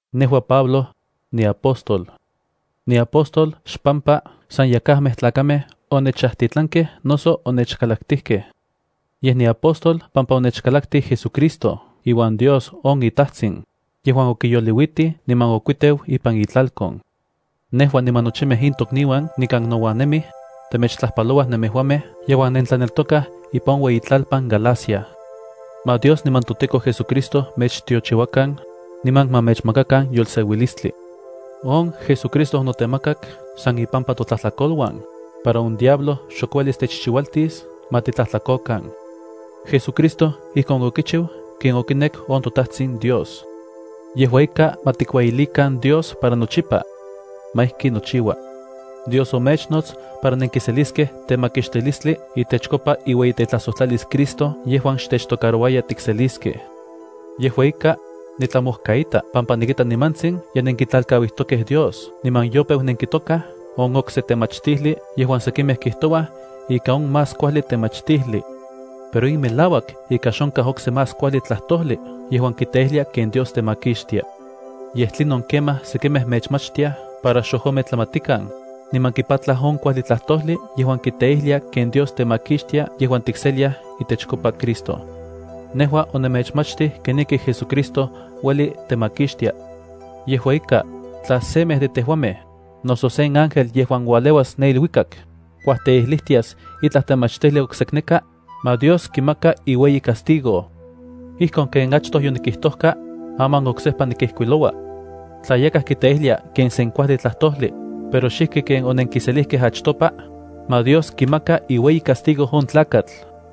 Nejua, Pablo, niapóstol. Niapóstol xpampa san yakajmej tlakamej onechajtitlankej. Yej niapóstol pampa onechkalaktij JesuCristo iuan Dios on iTajtsin yejuan okiyoliuitij niman okuiteu ipan itlalkon. Nejua niman nochimej in tokniuan nikan nouan nemij, temechtlajpalouaj nemejuamej yejuan nentlaneltokaj ipan on ueyitlalpan Galacia. Ma Dios niman toTEKO JesuCristo mechtiochiuakan, niman ma mechmakakan yolseuilistli. On JesuCristo onotemakak san ipampa totlajtlakoluan, para on diablo xok uelis techchiualtis ma titlajtlakokan. JesuCristo ijkon okichiu ken okinek on toTajtsin Dios. ¡Yejua ika ma tikueyilikan Dios para nochipa! Ma ijki nochiua. Dios omechnots para nenkiseliskej temakixtilistli itechkopa iueyitetlajsojtlalis Cristo yejuan xtechtocarouaya tikseliskej. Yejua ika, nitlamojkaita pampa nikita nimantsin ye nenkitlalkauijtokej Dios niman yopeu nenkitokaj on okse temachtijli yejuan sekimej kijtouaj ika on más kuajli temachtijli. Pero in melauak ika xonkaj okse más kuajli tlajtojli yejuan kiteijlia ken Dios temakixtia. Yej tlinon kemaj sekimej mechmachtiaj para xojometlamatikan, niman kipatlaj on kuajli tlajtojli yejuan kiteijlia ken Dios temakixtia yejuan tikseliaj itechkopa Cristo. Nejua onemechmachtij kenijki JesuCristo ueli techmakixtia. Yejua ika, tla semej de tejuamej, noso sen ángel yejuan ualeuas ne iluikak, kuajteijlijtias itlaj temachtijli oksekneka, ma Dios kimaka iueyi castigo. Ijkon ken achtoj yotikijtojkaj, aman oksejpa nikijkuiloua: tla yakaj kiteijlia ken sen kuajli tlajtojli, pero xijki ken onenkiselijkaj achtopa, ma Dios kimaka iueyicastigo on tlakatl.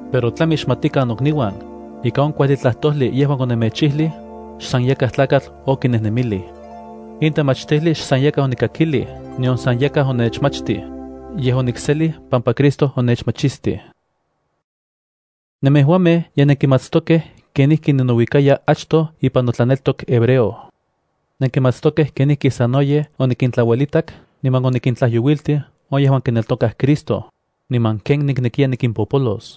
Pero tlami xmatikan nokniuan, ika on kuajli tlajtojli yejuan onemechijlij, xsan yakaj tlakatl okinejnemilij. In temachtijli xsan yakaj onikakilij nion san yakaj onechmachtij, yej onikselij pampa Cristo onechmachistij. Nemejuamej ye nenkimatstokej kenijki ninouikaya achtoj ipan notlaneltok hebreo. Nenkimatstokej kenijki sanoyej onikintlauelitak niman onikintlajyouiltij on yejuan kineltokaj Cristo, niman ken niknekiya nikimpopolos.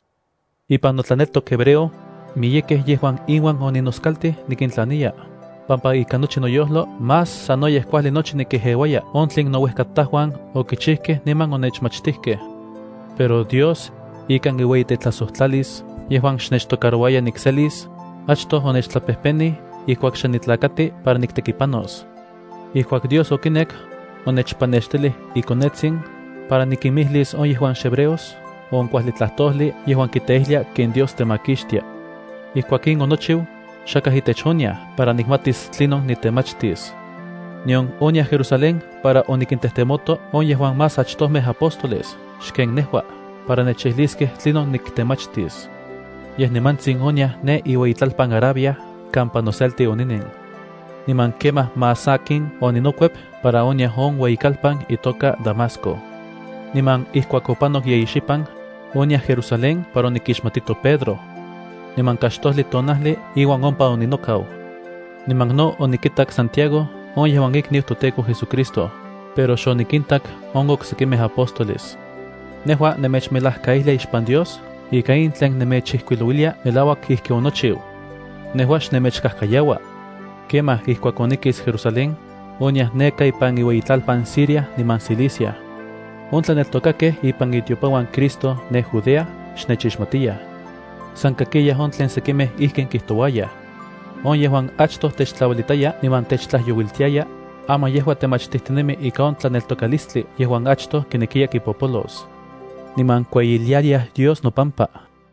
Ipan notlaneltok hebreo, miyekej yejuan inuan oninoskaltij nikintlaniya, pampa ikan nochi noyojlo más sanoyej kuajli nochi nikejeuaya on tlen nouejkatajuan okichijkej niman onechmachtijkej. Pero Dios, ikan iueyitetlajsojtlalis yejuan xnechtocarouaya nikselis, achtoj onechtlapejpenij ijkuak xe nitlakati para niktekipanos. Ijkuak Dios okinek, onechpanextilij iKonetsin para nikinmijlis on yejuan xhebreos on kuajli tlajtojli yejuan kiteijlia ken Dios temakixtia. Ijkuak in onochiu, xakaj itech oniaj para nikmatis tlinon nitemachtis. Nion oniaj Jerusalén para onikintejtemoto on yejuan más achtojmej apóstoles xken nejua para nechijliskej tlinon niktemachtis. Yej nimantsin oniaj ne iueyitlalpan Arabia kampa noselti oninen. Niman kemaj más sakin oninokuep para oniaj on ueyikalpan itoka Damasco. Niman ijkuak opanok yeyi xipan, oniaj Jerusalén para onikixmatito Pedro. Niman kaxtojli tonajli iuan ompa oninokau. Niman no onikitak Santiago on yejuan ikniu toTEKO JesuCristo, pero xonikintak on oksekimej apóstoles. Nejua nemechmelajkaijlia ixpan Dios ika in tlen nemechijkuilouilia melauak ijki onikchiu. Nejua xnemechkajkayaua. Kemaj ijkuak onikis Jerusalén, oniaj neka ipan iueyitlalpan Siria niman Cilicia. On tlaneltokakej ipan itiopanuan Cristo ne Judea xnechixmatiyaj. San kakiyaj on tlen sekimej kijtouayaj: “On yejuan achtoj techtlauelitaya niman techtlajyouiltiaya, aman yejua temachtijtinemi ika on tlaneltokalistli yejuan achtoj kinekiya kipopolos.” Niman kueyiliayaj Dios nopampa.